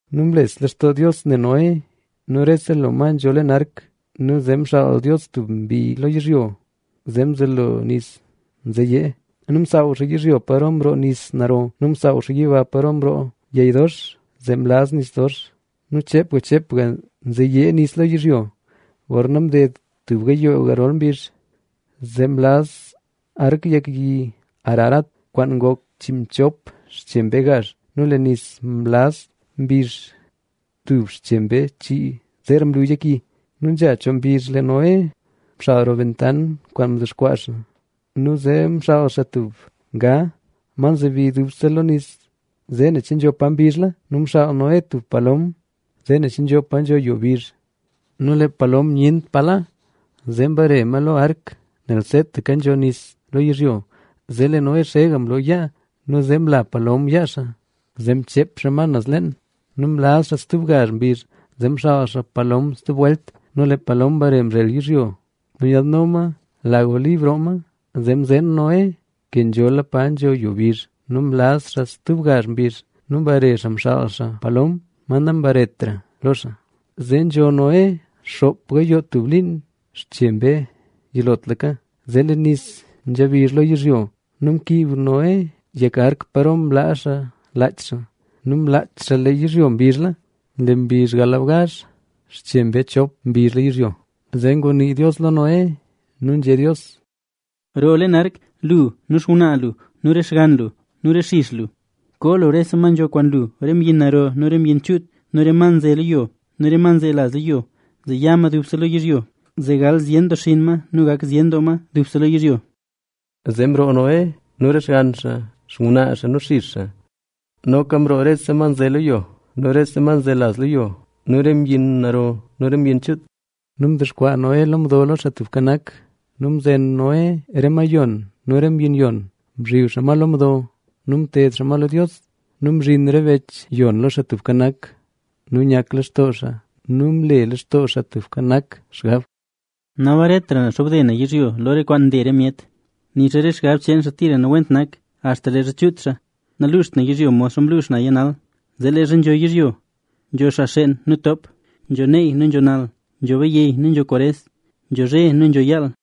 Nu mles lextoo Dios ne Noé nu rese lo ma nzho leen ark. Nu zee mxaal Dios tub mbi lo yizhyo zee mzelo nis nzeyee. Nu msaaw xaa yizhyo paro mroo nis naro nu msaaw xaa yiba paro mroo yey dox, zee mlaz nis dox. Nu cheepga cheepga nzeyee nis lo yizhyo. Gorna mded tub gayoo yirol mbizh, zee mlaz ark yek yi Ararat, kwaan ngok chiinmchop xche mbee gazh. Nu lee nis mlaz mbizh tub xche mbee chii zeera mlu yek yi. Nu nzha choo mbizh lee Noé mxal roo bentant kwaan mdexkwaa xaa. Nu zee mxaal xaa tub nga, ma mzobi lo nis zee ne che nzho pa mbizhla. Nu mxaal Noé tub palom zee ne xaa che nzho pa nzho yo bizh. Nu lee palom nyent pa la, zee mbare ma lo ark, nel seetaka nzho nis lo yizhyo. Zee lee Noé mloo yaa nu mla palom yaa xaa, zee mcheep xaa ma naz leen. Nu mlaz xaa stub gazh mbizh, zee mxaal xaa palom stub welt. Nu lee palom mbare mzhel yizhyo, nu nyaadno ma lag olib roo ma, zee mzeen Noé ke nzhola pa nzho yo mbizh. Nu mlaz xaa stub gazh mbizh nu mbare xaa mxaal xaa palom, ma nambaretra lo xaa. Zee nzho Noé xoop gayoo tub liin tub xche mbee yilotlaka, zee lee nis nzha bizh lo yizhyo. Nu mkiib Noé yek ark paro mlaa xaa laach xaa. Nu mlaach xaa lee yizhyo mbizhla. Lee mbizh galbgazh xche mbee chop, mbizhla yizhyo. Zee ngunii Dios lo Noé, nu nzhé Dios: —Roo leen ark, lu nu xngwnaa lu nu re xgann lu nu re xix lu. Koo lu rese ma nzho kwaan lu, re mbyin naro nu mbyin chuut nu re ma nze lo yo, nu re ma nzelaz lo yo, zee ya ma dubse lo yizhyo, zee gal zyen doo xinn ma nu gak ma zyen doo dubse lo yizhyo. Zee mroo Noé nu re xgann xaa, xngwnaa xaa nu xix xaa. Noka mroo rese ma nze lo yo nu re ma nzelaz lo yo nu re mbyin naro nu mbyin chuut. Nu mdexkwaa Noé lo mdo lo Xaa Tubka Nak nu mzen Noé re ma yon nu re mbyin yon, mzhib xaa ma lo mdo nu mted xaa ma lo Dios. Nu mzhin re bech yon lo Xaa Tubka Nak nu nyaklextoo xaa. Nu mle Xaa Tubka Nak xgab, “Nabaretra na xobde na yizhyo lo re kwaan nle re myet, nixa re xgab cheen xaa tira nawent nak axta leezha chuut xaa, naluuxt na yizhyo modxa mluux naya nal. Zee leezha nzho yizhyo; nzho xaa xeen nu ntoop, nzho neey nu nzho nal, nzho bayey nu nzho kwares, nzho zhe nu nzho yaal.